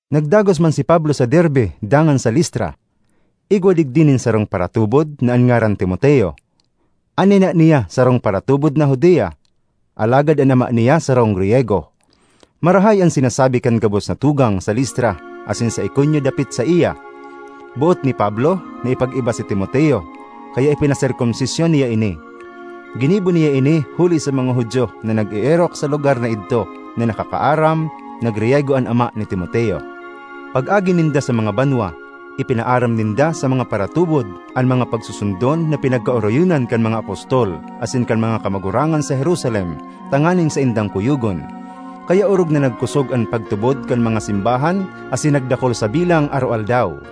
Nagdagos man si Pablo sa Derbe dangan sa Listra. Igwa digdi nin sarong paratubod na an ngaran Timoteo; an ina niya sarong paratubod na Judia, alagad an ama niya sarong Griyego. Marahay an sinasabi kan gabos na tugang sa Listra asin sa Iconio dapit saiya. Boot ni Pablo na ipag-iba si Timoteo, kaya ipinaserkomsisyon niya ini. Ginibo niya ini huli sa mga Judio na nag-eerok sa mga lugar na idto na nakakaaram na Griyego an ama ni Timoteo. Pag-agi ninda sa mga banwa, ipinaaram ninda sa mga paratubod an mga pagsusundon na pinagkaoroyonan kan mga apostol asin kan mga kamagurangan sa Jerusalem, tanganing saindang kuyogon. Kaya orog na nagkosog an pagtubod kan mga simbahan asin nagdakul sa bilang aroaldaw.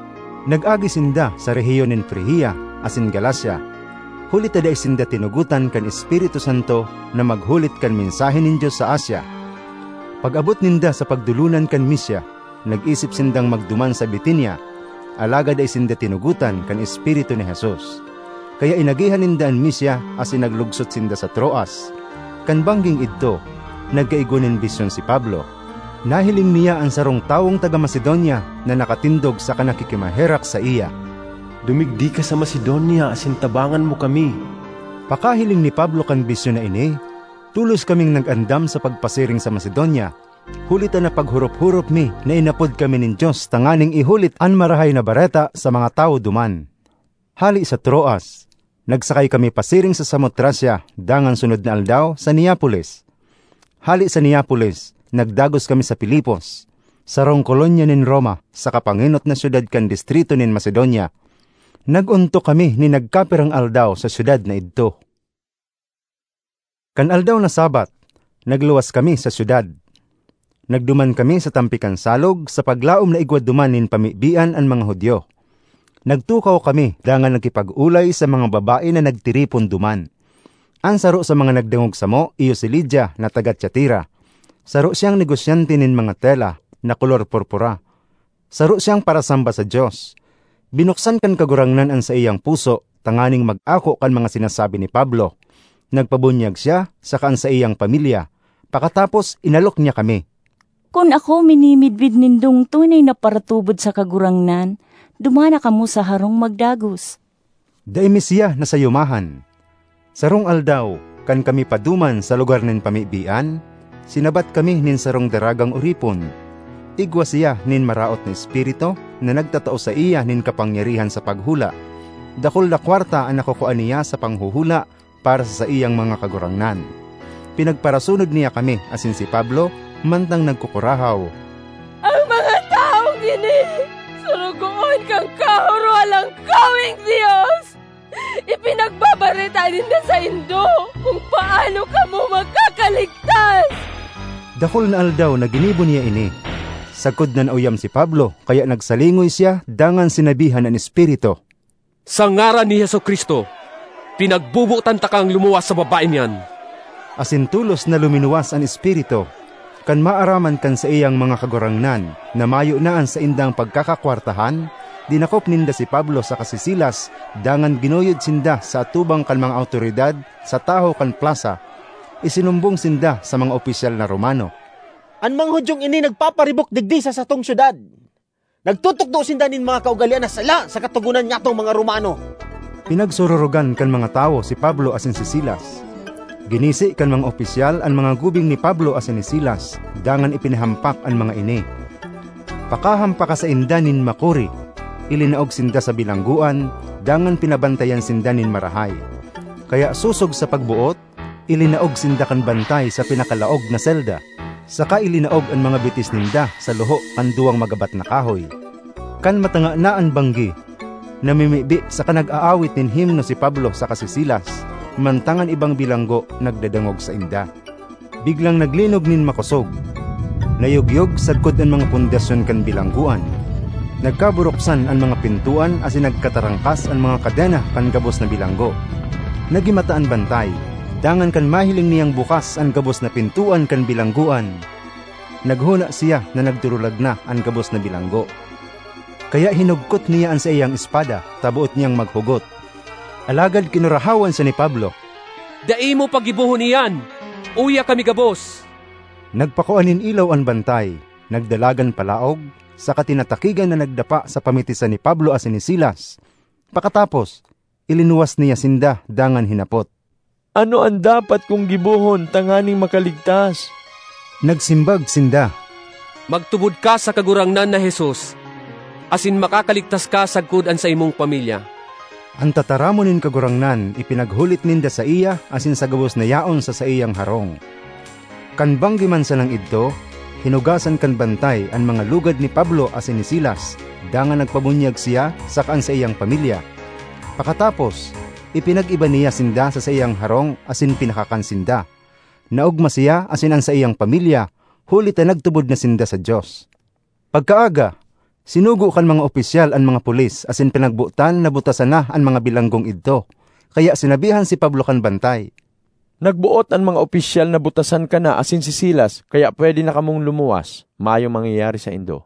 Nag-agi sinda sa rehiyon nin Frigia asin Galacia, huli ta dai sinda tinugotan kan Espiritu Santo na maghulit kan mensahe nin Dios sa Asia. Pag-abot ninda sa pagdolonan kan Misia, nag-isip sindang magduman sa Bitinia, alagad dai sinda tinugotan kan Espiritu ni Jesus. Kaya inagihan ninda an Misia asin naglugsot sinda sa Troas. Kan bangging idto, nagkaigwa nin bisyon si Pablo. Nahiling niya an sarong tawong taga Macedonia na nakatindog saka nakikimaherak saiya, “Dumigdi ka sa Macedonia asin tabangan mo kami!” Pakahiling ni Pablo kan bisyon na ini, tolos kaming nag-andam sa pagpasiring sa Macedonia, huli ta napaghorop-horop mi na inapod kami nin Dios tanganing ihulit an Marahay na Bareta sa mga tawo duman. Hale sa Troas, nagsakay kami pasiring sa Samotracia dangan sunod na aldaw, sa Neapolis. Hale sa Neapolis nagdagos kami sa Filipos, sarong kolonya nin Roma saka pangenot na syudad kan distrito nin Macedonia. Nag-ontok kami nin nagkapirang aldaw sa syudad na idto. Kan aldaw na Sabbath, nagluwas kami sa syudad. Nagduman kami sa tampi kan salog sa paglaom na igwa duman nin pamibian an mga Judio. Nagtukaw kami dangan nakipag-olay sa mga babae na nagtiripon duman. An saro sa mga nagdangog samo iyo si Lydia na taga Tiatira; saro siyang negosyante nin mga tela na kolor purpura. Saro siyang parasamba sa Dios. Binuksan kan Kagurangnan an saiyang puso tanganing mag-ako kan mga sinasabi ni Pablo. Nagpabunyag siya saka an saiyang pamilya. Pakatapos, inalok niya kami, “Kun ako minimidbid nindong tunay na paratubod sa Kagurangnan, duman na kamo sa harong magdagos.” Dai mi siya nasayumahan. Sarong aldaw, kan kami paduman sa lugar nin pamibian, sinabat kami nin sarong daragang oripon. Igwa siya nin maraot na espiritu na nagtatao saiya nin kapangyarihan sa paghula. Dakul na kwarta an nakukua niya sa panghuhula para sa saiyang mga kagurangnan. Pinagparasunod niya kami asin si Pablo mantang nagkukurahaw, “An mga tawong ini sorogoon kan Kahorohalangkaweng Dios! Ipinagbabareta ninda saindo kun paano kamo makakaligtas!” Dakul na aldaw na ginibo niya ini, sagkod na naoyam si Pablo kaya nagsalingoy siya dangan sinabihan an espiritu, “Sa ngaran ni Jesu-Cristo, pinagbobotan takang lumuwas sa babaeng iyan!” Asin tolos na luminuwas an espiritu. Kan maaraman kan saiyang mga kagurangnan na mayo na an saindang pagkakakwartahan, dinakop ninda si Pablo saka si Silas dangan ginuyod sinda sa atubang kan mga awtoridad sa tahaw kan plasa. Isinumbong sinda sa mga opisyal na Romano, “An mga Judiong ini nagpaparibok digdi sa satong syudad. Nagtutukdo sinda nin mga kaugalean na sala sa katogonan nyatong mga Romano.” Pinagsururogan kan mga tawo si Pablo asin si Silas. Ginisi kan mga opisyal an mga gubing ni Pablo asin ni Silas dangan ipinahampak an mga ini. Pakahampaka sainda nin makuri, ilinaog sinda sa bilanggoan, dangan pinabantayan sinda nin marahay. Kaya sosog sa pagboot, ilinaog sinda kan bantay sa pinakalaog na selda, saka ilinaog an mga bitis ninda sa luho kan duwang magabat na kahoy. Kan matanga na an banggi, namimibi saka nag-aawit nin himno si Pablo saka si Silas, mantang an ibang bilanggo nagdadangog sainda. Biglang naglinog nin makosog; nayogyog sagkod an mga pundasyon kan bilanggoan. Nagkaburuksan an mga pintoan asin nagkatarangkas an mga kadena kan gabos na bilanggo. Nagimata an bantay, dangan kan mahiling niyang bukas an gabos na pintoan kan bilanggoan, naghona siya na nagdurulag na an gabos na bilanggo; kaya hinugkot niya an saiyang espada ta boot niyang maghugot. Alagad kinurahawan siya ni Pablo, “Dai mo paggibohon iyan! Uya kami gabos!” Nagpakua nin ilaw an bantay, nagdalagan palaog, saka tinatakigan na nagdapa sa pamitisan ni Pablo asin ni Silas. Pakatapos, ilinuwas niya sinda dangan hinapot, “Ano an dapat kong gibohon tanganing makaligtas?” Nagsimbag sinda, “Magtubod ka sa Kagurangnan na Jesus asin makakaligtas ka sagkod an saimong pamilya.” An tataramon nin Kagurangnan ipinaghulit ninda saiya asin sa gabos na yaon sa saiyang harong. Kan banggi man sanang idto, hinugasan kan bantay an mga lugad ni Pablo asin ni Silas, dangan nagpabunyag siya saka an saiyang pamilya. Pakatapos, ipinag-iba niya sinda sa saiyang harong asin pinakakan sinda. Naogma siya asin an saiyang pamilya, huli ta nagtubod na sinda sa Dios. Pagkaaga, sinugo kan mga opisyal an mga pulis asin pinagbotan na butasan na an mga bilanggong idto. Kaya sinabihan si Pablo kan bantay, “Nagboot an mga opisyal na butasan ka na asin si Silas. Kaya pwede na kamong lumuwas; mayong mangyayari saindo.”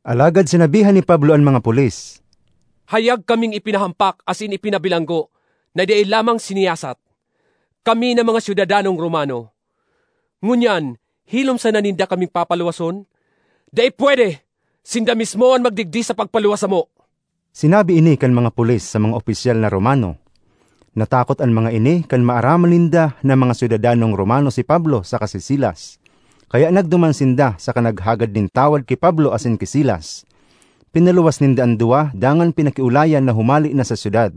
Alagad sinabihan ni Pablo an mga pulis, “Hayag kaming ipinahampak asin ipinabilanggo na dai lamang siniyasat, kami na mga syudadanong Romano. Ngunyan hilom sana ninda kaming papaluwason? Dai pwede! Sinda mismo an magdigdi sa pagpaluwas samo!” Sinabi ini kan mga pulis sa mga opisyal na Romano; natakot an mga ini kan maaraman ninda na mga syudadanong Romano si Pablo saka si Silas. Kaya nagduman sinda saka naghagad nin tawad ki Pablo asin ki Silas. Pinaluwas ninda an duwa dangan pinakiolayan na humale na sa syudad.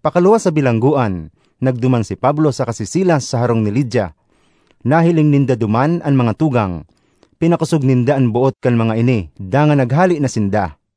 Pakaluwas sa bilanggoan, nagduman si Pablo saka si Silas sa harong ni Lydia. Nahiling ninda duman an mga tugang; pinakosog ninda an boot kan mga ini, dangan naghale na sinda.